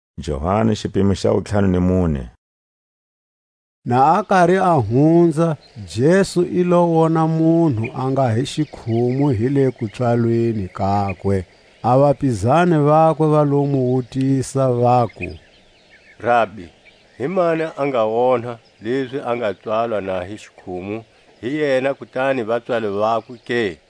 Jesu a hanyisa xikhumu. Na a kari a hunza, Jesu i lo wona munhu a nga hi xikhumu hi le kupswalweni kakwe. A vapizani vakwe va lo mu wutisa, vaku: Rabi, himani a nga onha, lezi a nga pswalwa na hi xikhumu, hi yena kutani vapswali vakwe ke?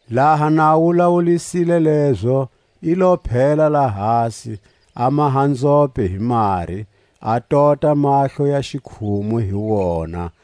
Laha na a wulawulisile lezo, i lo phela lahasi, a maha nzhope hi mari, a tota mahlo ya xikhumu hi wona.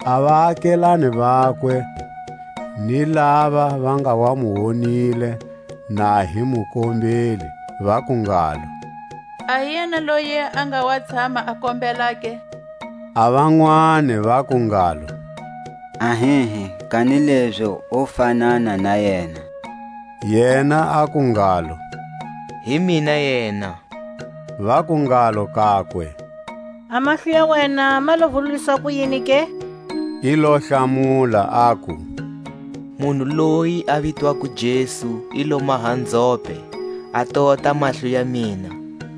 A vaakelane vakwe, ni lava va nga wa mu wonile na hi mukombeli, vaku ngalo: A hi yena loyi a nga wa tshama a kombela ke? A vanwani vaku ngalo: Ahihi, kanilezi o fanana na yena. Yena aku ngalo: Hi mina yena. Vaku ngalo kakwe: A mahlo ya wena ma lo vululiswa kuyini ke? I lo hlamula, aku: Munhu loyi a vitwako Jesu i lo maha nzhope, a tota mahlo ya mina,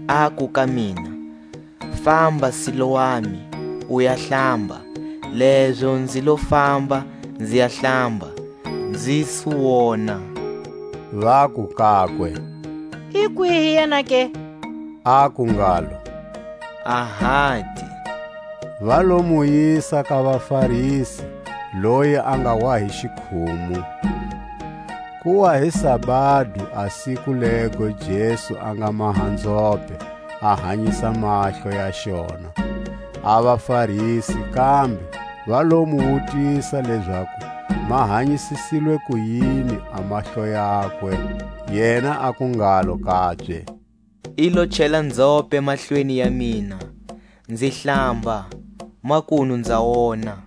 aku ka mina: Famba Siloami, u ya hlamba; lezo nzi lo famba, nzi ya hlamba, nzi su wona. Vaku kakwe: I kwihi yena ke? Aku ngalo: Ahati. Va lo mu yisa ka vaFarisi loyi a nga wa hi xikhumu. Ku wa hi sabado a siku lego Jesu a nga maha nzhope, a hanyisa mahlo ya xona. A vaFarisi kambe va lo mu wutisa lezaku ma hanyisisilwe kuyini a mahlo yakwe. Yena aku ngalo kabye: I lo chela nzhope mahlweni ya mina, nzi hlamba, makunu nza wona.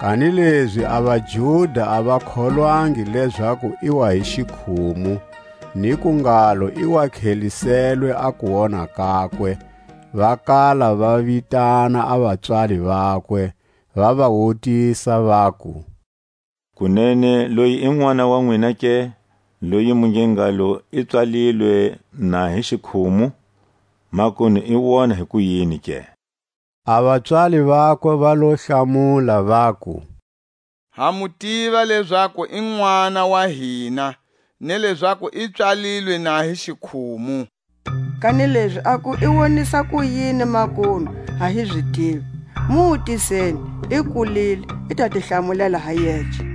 Kanilezi a vaJuda a va kholwangi lezaku i wa hi xikhumu, niku ngalo, i tlheliselwe a kuwona kakwe, va kala va vitana a vapswali vakwe, va va wutisa, vaku: Kunene loyi i nʼwana wa nwina ke, loyi mu nge ngalo i pswalilwe na hi xikhumu? Makunu i wona hikuyini ke? A vapswali vakwe va lo hlamula vaku: Ha mu tiva lezaku i nʼwana wa hina, ni lezaku i pswalilwe na hi xikhumu; kanilezi aku i wonisa kuyini makunu, a hi zi tivi; mu wutiseni, i kulile; i ta ti hlamulela ha yece.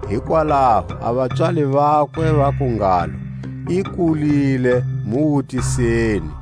Hikwalaho a vapswali vakwe vaku ngalo: I kulile, mu wutisani.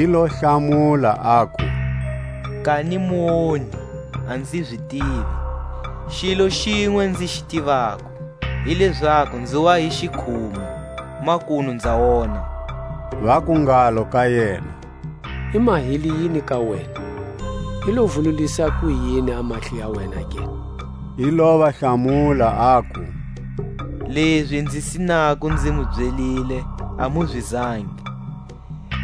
I lo hlamula, aku: Kani muonhi, a nzi zi tivi. Xilo xinwe nzi xi tivako, hi lezaku nzi wa hi xikhumu, makunu nza wona. Vaku ngalo ka yena: I mahile yini ka wena? I lo vululisa kuyini a mahlo ya wena ke? I lo va hlamula, aku: Lezi nzi sinako nzi mu byelile, a mu zwangi;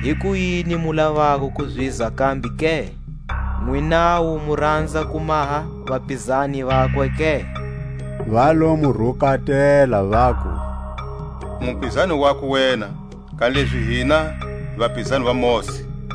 hikuyini mu lavako ku zizwa kambe ke? Nwinawu mu ranza ku maha vapizani vakwe ke? Va lo mu rukatela, vaku: U mupizani wakwe wena, kanilezi hina hi vapizani va Mosi.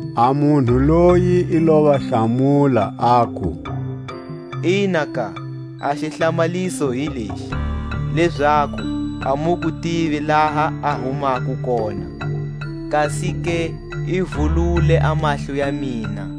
A munhu loyi i lo va hlamula, aku: Inaka, a xihlamaliso hi lexi, lezaku a mu ku tivi laha a humako kona, kasike i vulule a mahlo ya mina.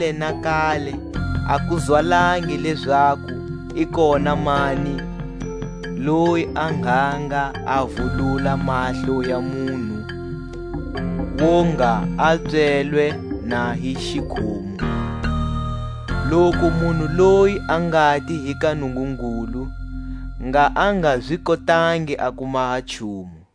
Kale na kale a ku zwalangi lezaku i kona mani loyi a ngha nga a vulula mahlo ya munhu wo nga a pswelwe na hi xikhumu. Loku munhu loyi a ngati hi ka Nungungulu, ngha a nga zi kotangi a ku maha nchumu.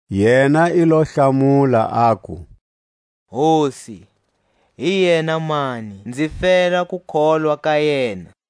Yena i lo hlamula, aku: Hosi, hi yena mani, nzi fela ku kholwa ka yena?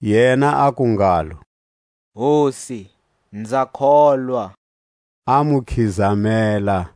Yena aku ngalo: Hosi, nza kholwa; a mu khizamela.